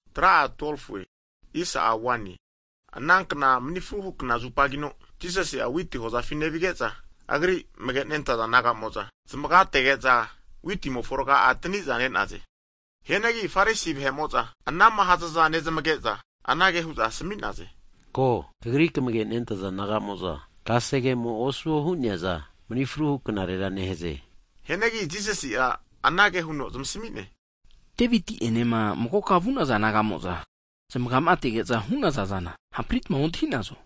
Hagi ana kna mani fruhu knazupagino (sabat), Jisasi'a witi hozafi nevige'za, Agri amage nentaza disaipol naga'mo'za zamaga'atege'za witimofo raga'a taniza ne'naze. Hianagi Farisi vahe'mo'za, anama hazaza nezmage'za, anage hu'za Jisasina asmi'naze, Ko! Kagri kamage nentaza disaipol naga'mo'za, kasegemo osuo hu'neaza mani fruhu knarera nehaze. Hianagi Jisasi'a anage huno zamasmi'ne. Deviti ene magokama vu'naza naga'mo'za zmagamatege'za hu'naza zana hampritma avontafepina ontahinazo?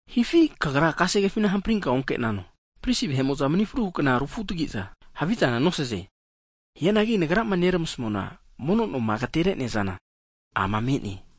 Hifi kagra kasegefina hamprinka onke'nano, pristi vahe'mo'za mani fruhu (Sabati) kna rufunetagizanagi havizana nosaze? Hianagi Nagrama neramasmuana, mono noma agatere'neazana ama me'ne.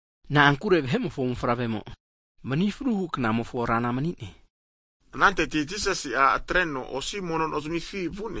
Na'ankure Vahe'mofo Mofavremo mani fruhu knamofona Rana mani'ne. Ananteti Jisasi'a atreno osi mono nozimifi (Sinagok) vu'ne.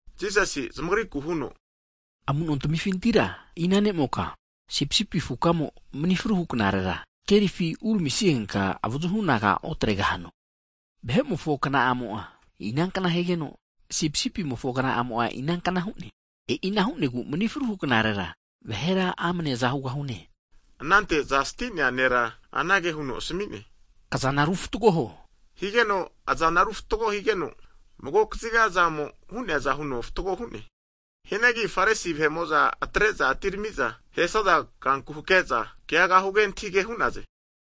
Jisasi'a zamagriku huno, Amu'no tamifintira ina ne'moka sipisipi afukamo mani fruhu knare'ma kerifi uramisigenka avazuhu anaga otregahano? Vahe'mofo kna'amo'a inankna higeno, sipisipimofo kna'amo'a inankna hu'ne, e'ina hu'negu manifruhu (sabat) knarera vahera amne aza hugahane. Anante aza sti'nea nera anage huno asmi'ne, Kazana ru fatgo huo! Higeno azana ru fatgo higeno, mago kaziga azamo hu'neaza huno fatgo hu'ne. Hianagi Farisi vahe'mo'za atre'za atinerami'za, ahesaza kanku hakeza keaga huge antahige hu'naze.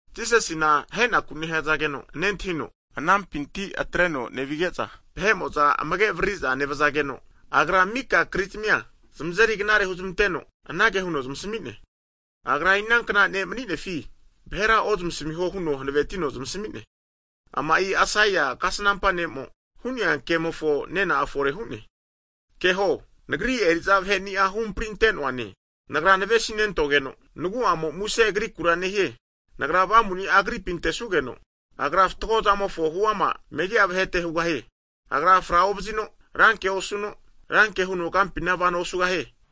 Jisasina ahenaku nehazageno nentahino, anampinti atreno nevige'za, rama'a vahe'mo'za amage avaririza nevazageno, Agra mika kri'zmia zamazeri knare hunezmanteno, anage huno zamasmi'ne, Agra'a inanka ne' mani'nefi vahera ozmasmiho huno hanavetino zamasmi'ne. Ama'i Aisaia kasnampa ne'mo hu'nea kemofo nena'a fore hu'ne. Keho Nagri eri'za vaheni'a huhamapri ante'noana, Nagra navesi nentogeno nagu'amo muse agrikura nehie. Nagra avamu ni'a agripi antesugeno, agra fatgo zamofona huama megi'a vahete hugahie. Agra fra ovazino, ranke osuno, ranke huno kampina vano osugahie.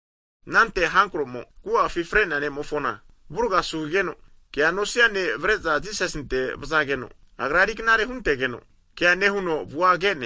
Anante hankro'mo agu'afi fre'nea ne'mofona avurga asu higeno kea nosia ne' avre'za Jisasinte vazageno, Agra eriknare huntegeno kea nehuno avua ke'ne.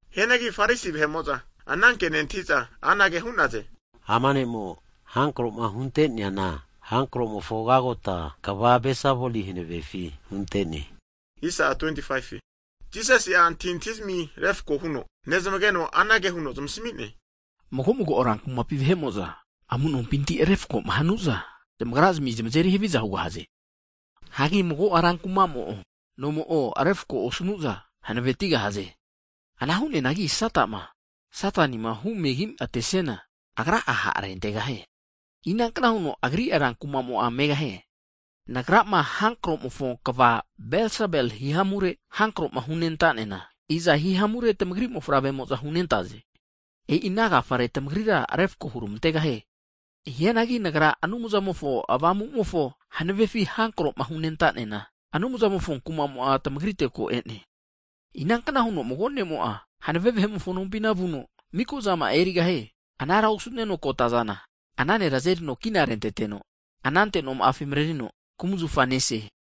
Hianagi Farisi vahe'mo'za ana ke nentahi'za anage hu'naze, Ama ne'mo hankro'ma hunte'neana, hankro'mofo kagota kva Belsebuli hanavefi hunte'ne hu'naze. Jisasi'a antahintahizmi refako huno nezmageno anage huno zamasmi'ne, Mago mago rankumapi vahe'mo'za amu'nompinti refakoma hanuza, zamagrazmi zamazeri haviza hugahaze. Hagi mago rankumamo'o, nomo o refako osnu'za hanavetigahaze. Ana hu'neanagi Satama, Satanima humegi atesiana, agra'a ha' arentegahie. Inankna huno agri rankumamo'a megahie. Nagrama hankromofo kva Belsebuli hihamure, hankroma hunentanena, iza hihamure tamagri mofavremo'za hunentaze? E'ina agafare tamagrira refako hurmantegahie. Hianagi Nagrama Anumzamofo hanavefi hankro'ma hunentanena, Anumzamofo kumamo'a tmagrite ko e'ne. Inankna huno mago ne'mo'a hanave vahe'mofo nompina vuno miko'zama'a erigahie. Anara osuneno kota'zana ana nera azerino kina renteteno, anante noma'afi mrerino kumzafa nese.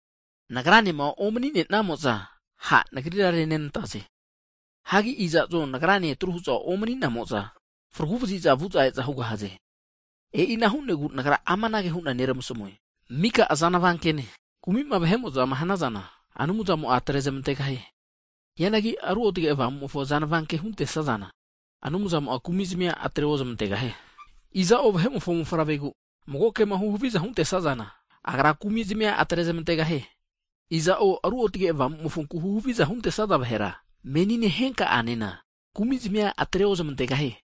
Nagranema omani'nenamo'za ha' Nagrira renenantaze. Hagi iza'zo Nagrane atru huza omani'namoza, fragu vaziza vu'za e'za hugahaze. E'ina hu'negu Nagra amanage hu'na neramasmue. Mika azanavankene kumi'ma vahe'mo'zama hanazana, Anumzamo'a atre zmantegahie. Hianagi Ruotge Avamumofo azanava ke huntesazana, Anumzamo'a kumi zmia atre ozmantegahie. Iza'o Vahe'mofo Mofavregu mago kema huhaviza hunte'sazana, Agra kumizmi'a atre zmantegahie. Hianagi iza'o Ruotge Avamumofonku huhaviza huntesaza vahera menine, henka'anena kumi zami'a atre ozmantegahie.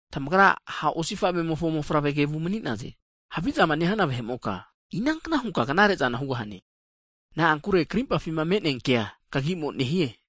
Tamagra ha' osifave'mofo mofavre kevu mani'naze. Havizama nehana vahe'moka, inankna hunka knare'zana hugahane? Na'ankure krimpafi me'nea kea kagi'mo nehie.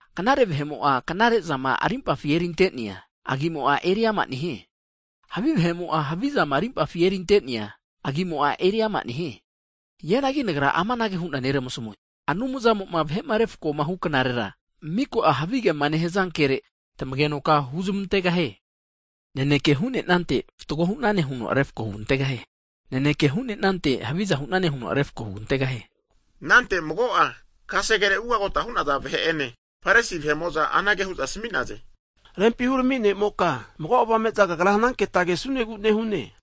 Knare vahe'mo'a knare'zama rimpafima erinte'neaza, agimo'a eriama nehie. Havi vahe'mo'a havizama rimpafi erinte'nea agi'mo'a eriama nehie. Hianagi Nagra amanage hu'na neramasamue, Anumzamo'ma vahe'ma refakoma huknarera, miko'a havigema nehaza kere, tamagenoka huzmantegahie. Naneke hunante fatgo hu'nane huno refako hugantegahie. Naneke hunenante haviza hu'nane huno refako hugantegahie. Anante mago'a kasegere ugagota hu'naza vahe ene Farisi vahe'mo'za anage hu'za asmi'naze, Rempi Hurami ne'moka, mago avame'za Kagra hananketa kesunegu nehune.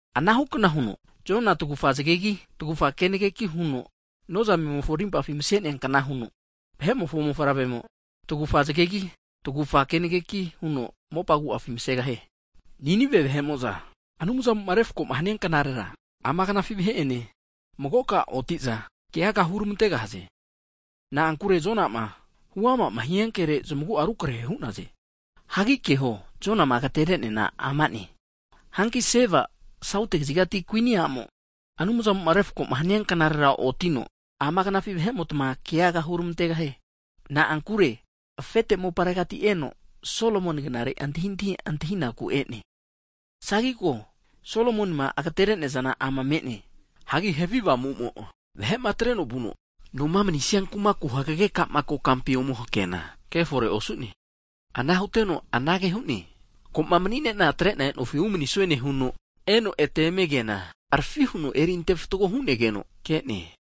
Anahu kna huno, Jona'a tagufa zagegi tagufa haninki huno nozamemofo rimpafi mase'neankna huno Vahe'mofo Mofavremo tagufa zagegi, tagufa haninki huno mopa agu'afi masegahie. Ninive vahe'mo'za Anumzamoma refakoma hania knarera, ama knafi vahe ene magoka oti'za, keaga hurmantegahaze. Na'ankure Jona'ma huama hia kere zmagu'a rukrahe hu'naze. Hagi keho Jonama agatere'neana ama'ne. Hanki sauti kazigati kuini a'mo Anumzamo'ma refakoma hania knarera otino, ama knafi vahe'motma keaga hurmantegahie. Na'ankure afete moparegati eno Solomoni knare antahintahi antahinaku e'ne. Hagi ko, Solomonima agatere'neazana ama me'ne. Hagi havi avamu'mo, vahe'ma atreno vuno, noma manisia kumaku hagege kokampi ome hakeana kefore osu'ne. Ana huteno anage hu'ne, ko'ma mani'nena atre'na e'nofi umanisue nehuno, eno eme keana harafi huno eri antefatgo hu'negeno ke'ne.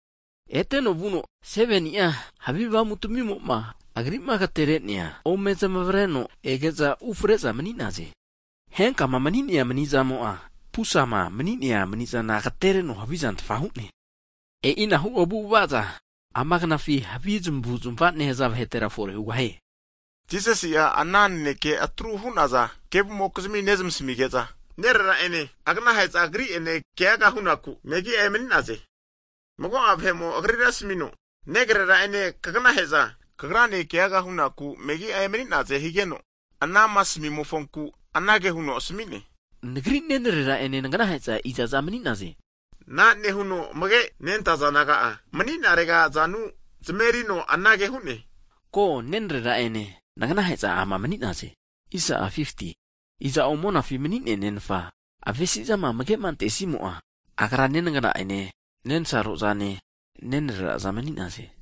Eteno vuno 7ni'a havi avamu tmimo'ma agri'ma agtere'nea ome zamavreno ege'za ufre'za mani'naze. Henkama mani'nea mani'zamo'a, pusama mani'nea mani'zana agtereno havi zantfa hu'ne. E'inahu avu'avaza ama knafi havi zamavu'zmava nehaza vahetera fore hugahie. Jisasi'a ana naneke atru hu'naza vahe kevumokizmi nezmasmige'za, Nerera ene aganahe'za Agri'ene keaga hunaku megi'a emani'naze. Anante mago'a vahe'mo Agrira asmino, Negrera'ene kagnahe'za Kagrane keaga hunaku megi'a emani'naze higeno, anama asmi'mofonku anage huno asmi'ne, Nagri nenrera ene nagnahe'za izaza mani'naze? Ana nehuno amage nentaza disaipol naga'a mani'narega azanu zmerino anage hu'ne. Ko, nenrera ene naganahe'za ama mani'naze. Iza'o monafi mani'nea Nenfa avesi'zama amage'ma antesimo'a, agra nenagna'ene nensarozane, nenreraza mani'naze.